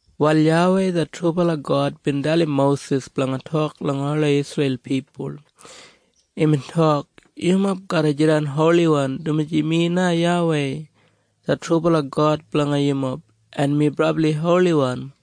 Wal YAWEI det trubala God bin dalim Mosis blanga tok langa ola Isreil pipul. Imbin tok, “Yumob garra jidan holiwan, dumaji mi na YAWEI det trubala God blanga yumob, en mi brabli holiwan.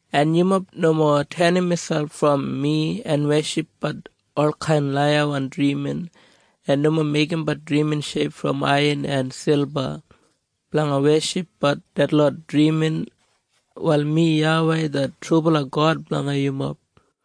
“En yumob nomo tenim miselp brom mi en weshipbat olkain laiyawan drimin, en nomo meigimbat drimin sheip brom aiyan en silba blanga weshipbat detlot drimin. Wal mi YAWEI det trubala God blanga yumob.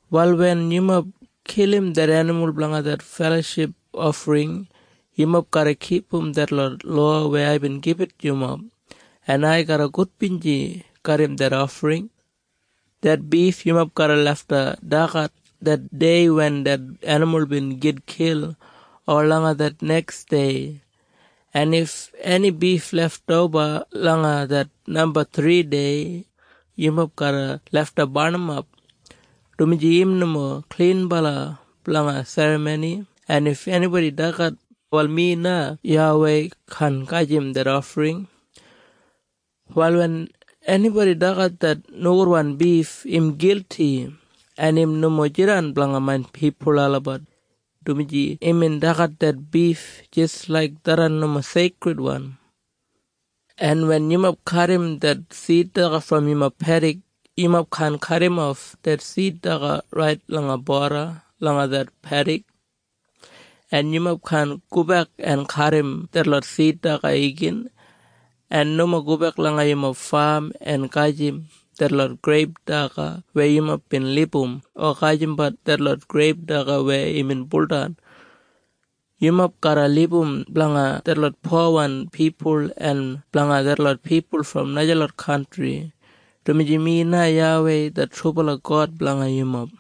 “Wal wen yumob kilim det enimul blanga det feloship ofring, yumob garra kipum detlot lowa weya aibin gibit yumob, en ai garra gudbinji garram det ofring. Det bif yumob garra lafta dagat det dei wen det enimul bin gitkil o langa det neksdei. En if eni bif leftoba langa det namba thridei, yumob garra lafta barnimap, dumaji im nomo klinbala blanga serramoni en if enibodi dagat, wal mi na YAWEI, kaan gajim det ofring. Wal wen enibodi dagat det nogudwan bif im gilti, en im nomo jidan blanga main pipul olabat, dumaji imbin dagat det bif jis laik tharran nomo seikridwan. “En wen yumob kadim det sid daga brom yumob pedik, yumob kaan kadimof det sid daga rait langa boda langa det pedik, en yumob kaan gobek en kadim detlot sid daga igin. En nomo gobek langa yumob fam en gajim detlot greip daga weya yumob bin libum o gajimbat detlot greip daga weya imbin buldan. Yumob garra libum blanga detlot powan pipul en blanga detlot pipul brom najalot kantri, dumaji mi na YAWEI det trubala God blanga yumob.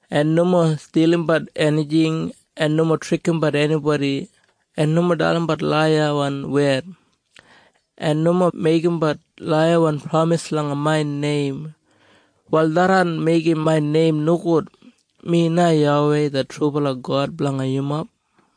“En nomo stilimbat enijing, en nomo trikimbat enibodi en nomo dalimbat laiyawan wed. En nomo meigimbat laiyawan pramis langa main neim. Wal tharran meigim main neim nogud. Mi na YAWEI det trubala God blanga yumob.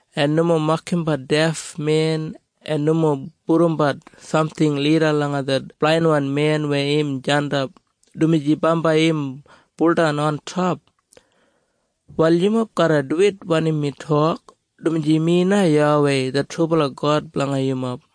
En nomo mokimbat defmen, en nomo pudumbat samting lida langa det blainwan men weya im jandap, dumaji bambai im buldan ontop. Wal yumob garra duwit wanim mi tok, dumaji mi na YAWEI det trubala God blanga yumob.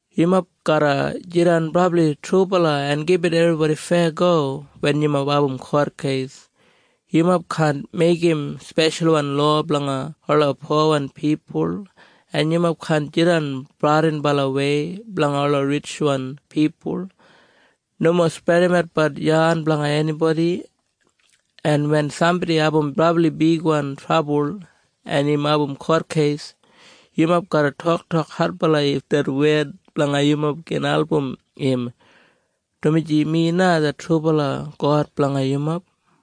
“Yumob garra jidan brabli trubala en gibit ebribodi feyago wen yumob abum kotkeis. Yumob kaan meigim speshalwan lowa blanga ola powan pipul, en yumob kaan jidan bradinbalawei blanga ola ritjwan pipul. Nomo spredimatbat yan blanga enibodi, en wen sambodi abum brabli bigwan trabul en im abum kotkeis, yumob garra toktok adbala if det wed blanga yumob gin album im, dumaji mi na det trubala God blanga yumob.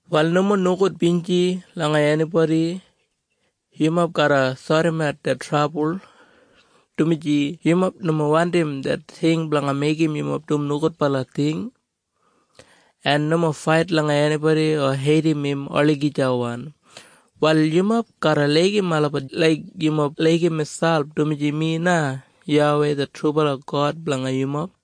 “Wal nomo nogudbinji langa enibodi. Yumob garra sodimat det trabul, dumaji yumob nomo wandim det ting blanga meigim yumob dum nogudbala ting. En nomo fait langa enibodi o heidim im olagijawan. Wal yumob garra laigim olabat laik yumob laigim miselp dumaji mi na YAWEI det trubala God blanga yumob.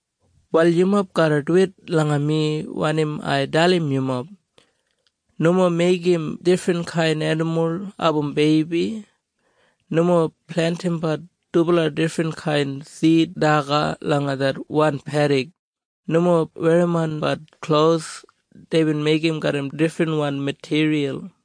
“Wal yumob garra duwit langa mi wanim ai dalim yumob. Nomo meigim difrinkain enimul abum beibi. Nomo plentimbat dubala difrinkain sid daga langa det wan pedik. Nomo werrimonbat klos deibin meigim garram difrinwan matiriyal.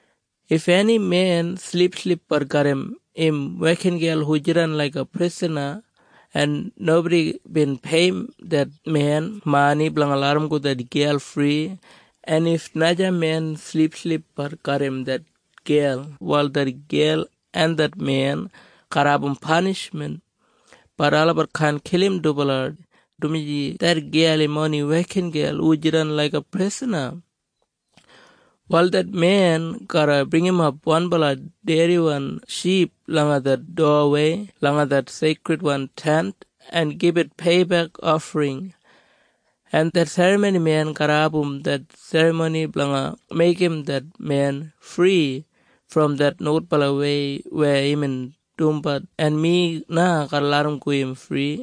“If eni men silipsilipbat garram im wekingel hu jidan laiga prisana en nobodi bin peiyim det men mani blanga larramgo det gel fri, en if naja men silipsilipbat garram det gel, wal det gel en det men garra abum panishmen, bat olabat kaan kilim dubala, dumaji det gel im oni wekingel hu jidan laiga prisana. Wal det men garra bringimap wanbala dediwan ship langa det dowawei langa det Seikridwan Tent, en gibit peibek ofring. En det serramonimen garra abum det serramoni blanga meigim det men fri brom det nogudbalawei weya imbin dumbat en mi na garra larramgo im fri.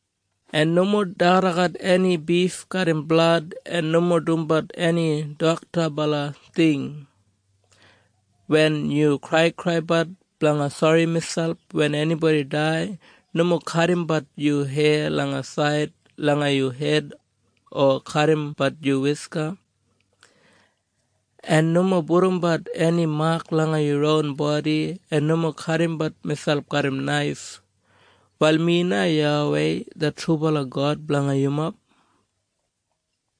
“En nomo dagadagat eni bif garram blad, en nomo dumbat eni doktabala ting. Wen yu kraikraibat blanga sori miselp wen enibodi dai, nomo kadimbat yu heya langa said langa yu hed, o kadimbat yu wiska, en nomo pudumbat eni mak langa yu ron bodi, en nomo kadimbat miselp garram naif. Wal mi na YAWEI det trubala God blanga yumob.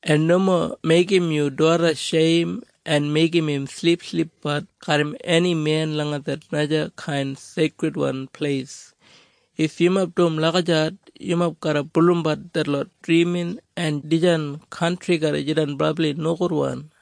“En nomo meigim yu doda sheim en meigim im silipsilipbat garram eni men langa det najakain seikridwan pleis. If yumob dum lagijat yumob garra bulurrumbat detlot drimin en dijan kantri garra jidan brabli nogudwan.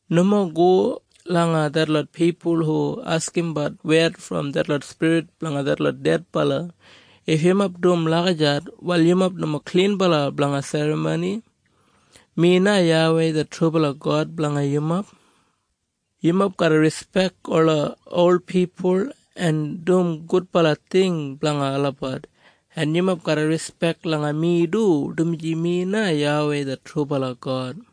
“Nomo go langa detlot pipul hu askimbat wed brom detlot spirit blanga detlot dedbala. If yumob dum lagijat wal yumob nomo klinbala blanga serramoni. Mi na YAWEI det trubala God blanga yumob. “Yumob garra rispek ola ol pipul en dum gudbala ting blanga olabat en yumob garra rispek langa mi du, dumaji mi na YAWEI det trubala God.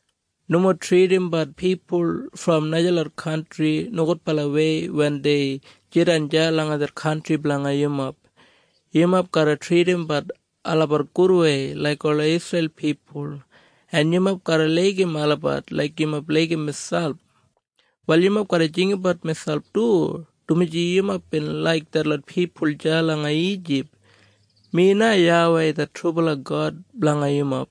“Nomo tridimbat pipul brom najalot kantri nogudbalawei wen dei jidan deya langa det kantri blanga yumob. Yumob garra tridimbat olabat gudwei laik ola Isreil pipul, en yumob garra laigim olabat laik yumob laigim miselp. Wal yumob garra jinggabat miselp du, dumaji yumob bin laik detlot pipul deya langa Ijip. Mi na YAWEI det trubala God blanga yumob.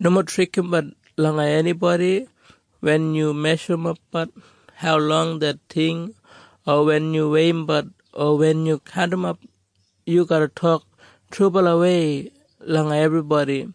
“Nomo trikimbat langa enibodi wen yu meshurumbat haulong det ting, o wen yu weiyimbat o wen yu kaundimap. Yu garra tok trubalawei langa ebribodi.